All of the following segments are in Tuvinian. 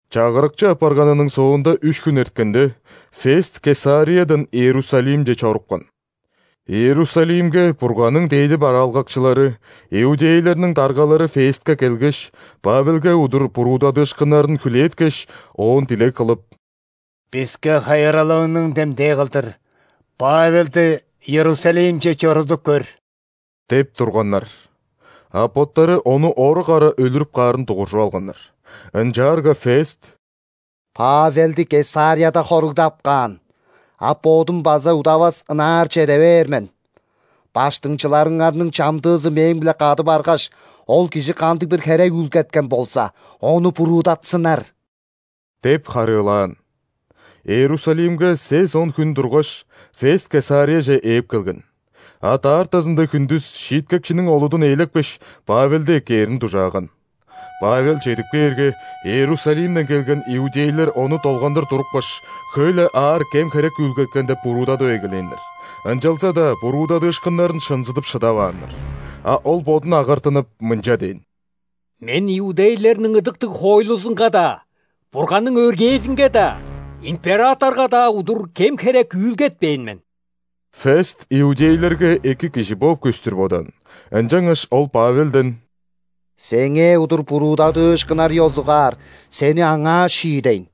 Чагырыкчы апарганының соонда үш хүн эрткенде, Фест Кесариядан Иерусалимче чорупкан. Иерусалимге Бурганның дээди бараалгакчылары, иудейлерниң даргалары Фестке келгеш, Павелге удур буруудадыышкыннарын хүлээткеш, оон дилег кылып: «Биске хайыралыыңның демдээ кылдыр Павелди Иерусалимче чорудуп көр» – деп турганнар. А боттары ону орук ара өлүрүп каарын дугуржуп алганнар. Ынчаарга Фест: «Павелди Кесарияда хоругдап каан, а бодум база удавас ынаар чеде бээр мен. Баштыңчыларыңарның чамдыызы мээң-биле кады баргаш, ол кижи кандыг-бир херек үүлгеткен болза, ону буруудатсыннар» – деп харыылаан. Иерусалимге сес-он хүн тургаш, Фест Кесарияже ээп келген. А даартазында хүндүс шииткекчиниң олудун ээлепкеш, Павелди эккээрин дужааган. Павел чедип кээрге, Иерусалимден келген иудейлер ону долгандыр турупкаш, хөй-ле аар кем-херек үүлгеткен деп буруудадып эгелээннер, ынчалза-даа буруудадыышкыннарын шынзыдып шыдавааннар. А ол бодун агартынып, мынча дээн: «Мен иудейлерниң ыдыктыг хоойлузунга-даа, Бурганның өргээзинге-даа, императорга-даа удур кем-херек үүлгетпээн мен». Фест иудейлерге эки кижи бооп көстүр бодаан, ынчангаш ол Павелден: «Сеңээ удур буруудадыышкыннар ёзугаар сени аңаа шиидейн,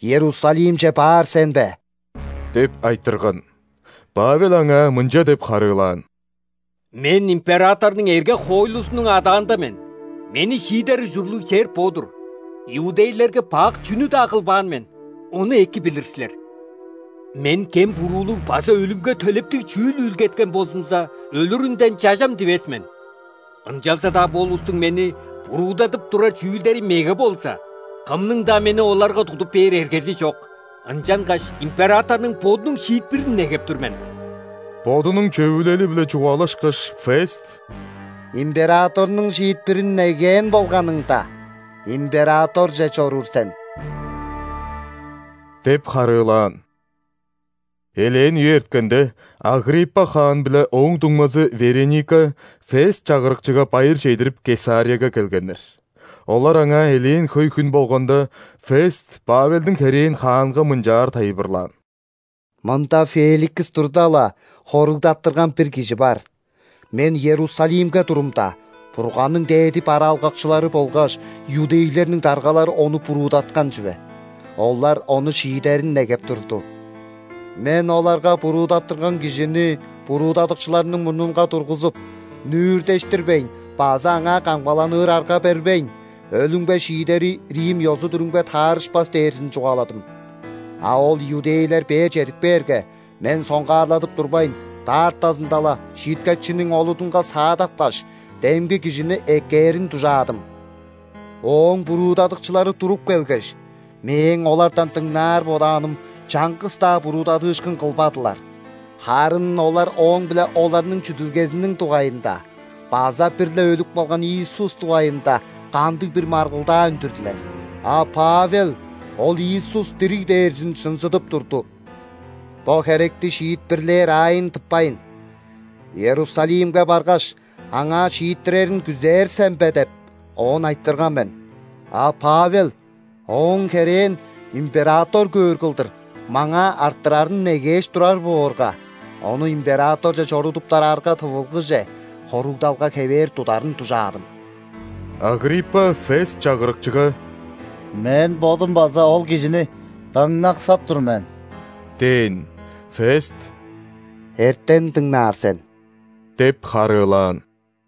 Иерусалимче баар сен бе?» – деп айтырган. Павел аңаа мынча деп харыылаан: «Мен императорнуң эрге-хоойлузунуң адаанда мен, мени шиидер ужурлуг чер бо-дур. Иудейлерге бак чүнү-даа кылбаан мен, ону эки билир силер. Мен кем-буруулуг база өлүмге төлептиг чүүл үүлгеткен болзумза, өлүрүнден чажам дивес мен. Ынчалза-даа бо улустуң мени буруудадып турар чүүлдери меге болза, кымның-даа мени оларга тудуп бээр эргези чок. Ынчангаш императорнуң бодунуң шиитпирин негеп тур мен!» Бодунуң чөвүлели-биле чугаалашкаш, Фест: «Императорнуң шиитпирин негээн болганыңда, императорже чоруур сен» – деп харыылаан. Элээн үе эрткенде, Агриппа хаан биле ооң дуңмазы Вереника Фест чагырыкчыга байыр чедирип, Кесарияга келгеннер. Олар аңаа элээн хөй хүн болганда, Фест Павелдиң херээн хаанга мынчаар тайылбырлаан: «Мында Феликс турда-ла хоругдаттырган бир кижи бар. Мен Иерусалимге турумда, Бурганның дээди бараалгакчылары болгаш иудейлерниң даргалары ону буруудаткан чүве. Олар ону шиидерин негеп турду. Мен оларга буруудаттырган кижини буруудадыкчыларының мурнунга тургузуп, нүүртештирбейн база аңаа камгаланыр арга бербейн, өлүмге шиидери рим ёзу-дүрүмге таарышпас дээрзин чугааладым. А ол иудейлер бээр чедип кээрге, мен соңгаарладып турбайн, даартазында-ла шииткекчиниң олудунга саадапкаш, демги кижини эккээрин дужаадым. Ооң буруудадыкчылары туруп келгеш, мээң олардан дыңнаар бодааным чаңгыс-даа буруудадыышкын кылбадылар. Харын олар ооң-биле оларның чүдүлгезиниң дугайында база бир-ле өлүп калган Иисус дугайында кандыг-бир маргылдаа үндүрдүлер, а Павел ол Иисус дириг дээрзин шынзыдып турду. Бо херекти шиитпирлээр аайын тыппайн: „Иерусалимге баргаш, аңаа шииттирерин күзээр сен бе?“ – деп, оон айтырган мен. А Павел ооң херээн император көөр кылдыр маңаа арттырарын негээш турар боорга, ону императорже чорудуптар арга тывылгыже, хоругдалга хевээр тударын дужаадым». Агриппа Фест чагырыкчыга: «Мен бодум база ол кижини дыңнаксап тур мен» – дээн. Фест: «Эртен дыңнаар сен» – деп харыылаан.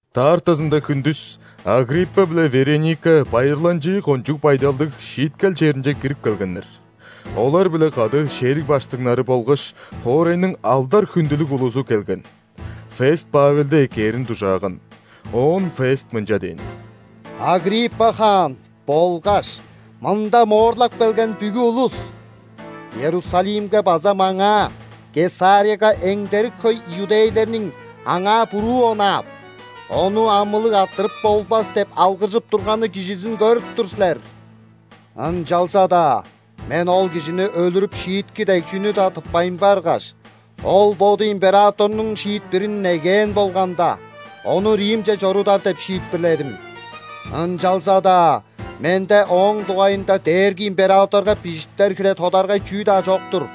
Даартазында хүндүс Агриппа биле Вереника байырланчыы кончуг байдалдыг шииткел черинче кирип келгеннер. Олар-биле кады шериг баштыңнары болгаш хоорайның алдар-хүндүлүг улузу келген. Фест Павелди эккээрин дужааган. Оон Фест мынча дээн: «Агриппа хаан болгаш мында моорлап келген бүгү улус! Иерусалимге база маңаа – Кесарияга эңдерик хөй иудейлерниң аңаа буруу онаап: „Ону амылыг арттырып болбас!“ – деп алгыржып турганы кижизин көрүп тур силер. Ынчалза-даа мен ол кижини өлүрүп шиитки дег чүнү-даа тыппайн баргаш, ол боду императорнуң шиитпирин негээн болганда, ону Римче чорудар деп шиитпирледим. Ынчалза-даа менде ооң дугайында дээрги императорга бижиптер хире тодаргай чүү-даа чок-тур.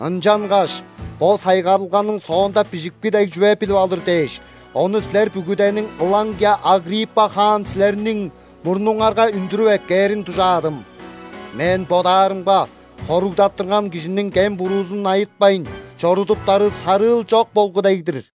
Ынчангаш бо сайгарылганың соонда бижипки дег чүве билип алыр дээш, ону силер бүгүдениң, ылаңгыя Агриппа хаан силерниң, мурнуңарга үндүрүп эккээрин дужаадым. Мен бодаарымга, хоругдаттырган кижиниң кем-буруузун айытпайн чорудуптары сарыыл чок болгу дег-дир».